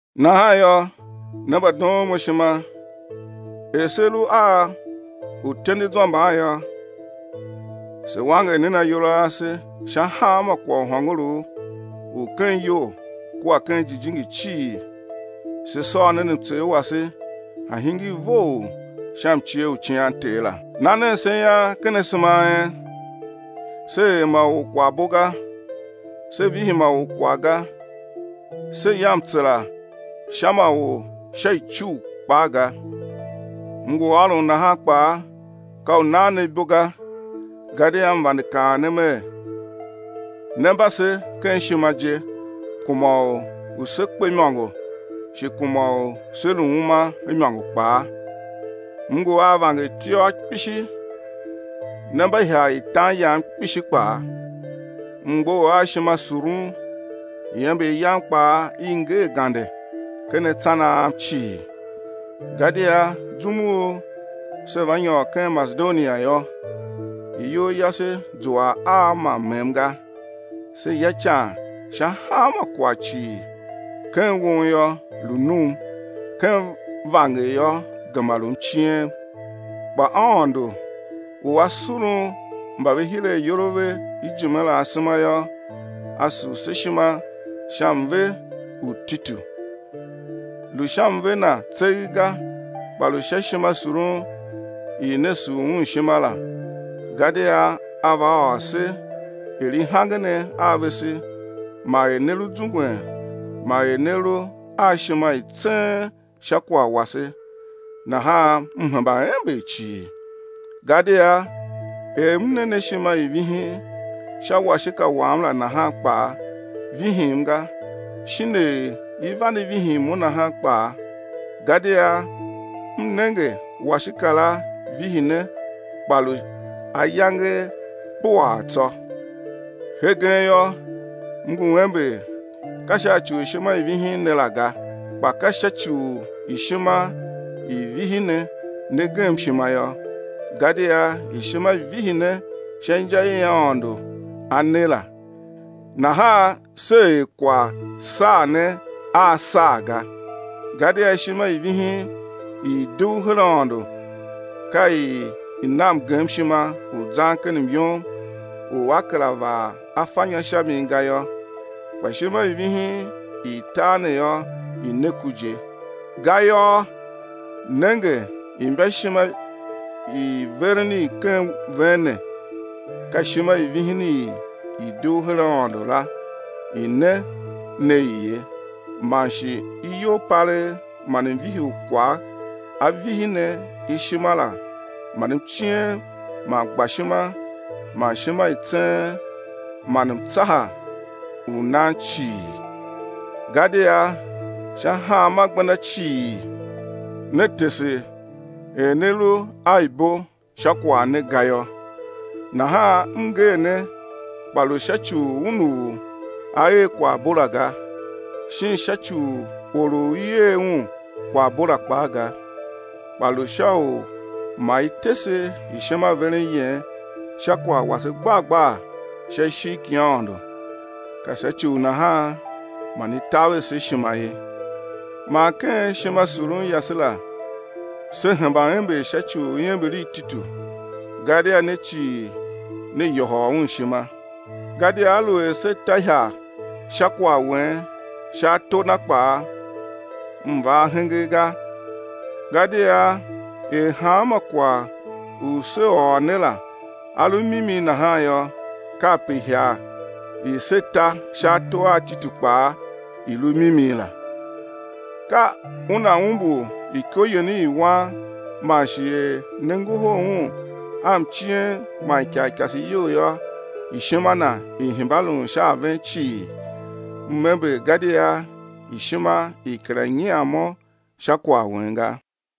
Nahan yô, ne mbadoon mo ishima, er se lu a uityendezwa mban yô, se wanger nen ayol a ase sha hanma kwagh u hôngorough u ken iyol kua ken jijingi cii, se sôr nen mtsegh wase, a̱ hingir vough sha mcie u cian Ter la. Na nen se ian ken asema a en. Se er ma or kwaghbo ga. Se vihi ma or kwagh ga, se ya mtsera sha ma or sha icugh kpaa ga. M ngu ôron nahan kpaa ka u nan ne ibo ga, gadia m vande kaan ne mer, né mba se ken ishima je kuma u sé kpe imôngo shi kuma u sé lu uma imôngo kpaa. M ngu a vangertiôr kpishi, ne mba ihagh i tan yam kpishi kpaa. M mgbough a ishimasurun, iember yam kpaa i ngee gande ken atsan a am cii. Gadia zum u se va nyôr ken Masedonia yô, iyol yase zua a ma mmem ga, se ya ican sha hanma kwagh cii: ken won yô, lu num, ken vanger yô gema lu mciem. Kpa Aôndo u A surun mba ve hir ayol a ve ijime la asema yô, A sur se ishima sha mve u Titu. Lu sha mve na tseegh ga kpa lu sha ishimasurun i ne sur un ishima la, gadia a va ôr se er i hange ne a vese man er ne lu zungwen man er ne lu a ishima i tseen sha kwagh wase, nahan m hemba ember cii. Gadia er m ne ne ishima i vihin sha washika wam la nahan kpaa, vihim ga shin er i vande vihin mo nahan kpaa; gadia m nenge washika la vihi ne kpa lu ayange kpuaa tsô. Hegen yô m ngu ember ka sha ci u ishima i vihi ne la ga, kpa ka sha ci u ishima i vihi ne, ne gem ishima yô, gadia ishima vihi ne sha inja i Aôndo A ne la, nahan se er, kwagh saa ne a saa ga. Gadia ishima i vihin i i dugh her Aôndo ka i na mgemshima u zan ken myom u á kera vaa afanyô sha mi ga yô, kpa ishima i vihin i tar ne yô i ne ku je. Gayô nenge imbaishima i veren i ken ven ne, ka ishima i vihin i i dugh her Aôndo la i ne ne i ye, man shi iyolpalegh man mvihi u kwagh a vihi ne ishima la man mciem, man gbashima man ishima i tseen man mtsaha u nan cii. Gadia sha hanma gbenda cii ne tese er ne lu a ibo sha kwagh ne ga yô. Nahan m nger ne kpa lu sha ci u un u a er kwaghbo la ga, shin sha ci u or u i er un kwaghbo la kpaa ga, kpa lu sha u ma i tese ishimaveren yen sha kwagh wase gbar gbar sha ishigh ki Aôndo. Ka sha ci u nahan man i taver se ishima ye. Man ken ishimasurun yase la se hemba ember sha ci u iember i Titu, gadia ne cii ne yôhôl un ishima. Gadia aluer se ta ihagh sha kwagh wen sha ato na kpaa, m va ahenge ga gadia er hanma kwagh u se ôr ne la a lu mimi nahan yô, kape ihagh i se ta sha ato a Titu kpaa i lu mimi la. Ka una umbur iko yen i wan man shi er ne ngohol un a mciem man ikarikase iyol yô, ishima na i hemba lun sha a ven cii. M ember gadia ishima i kera nyian mo sha kwagh wen ga.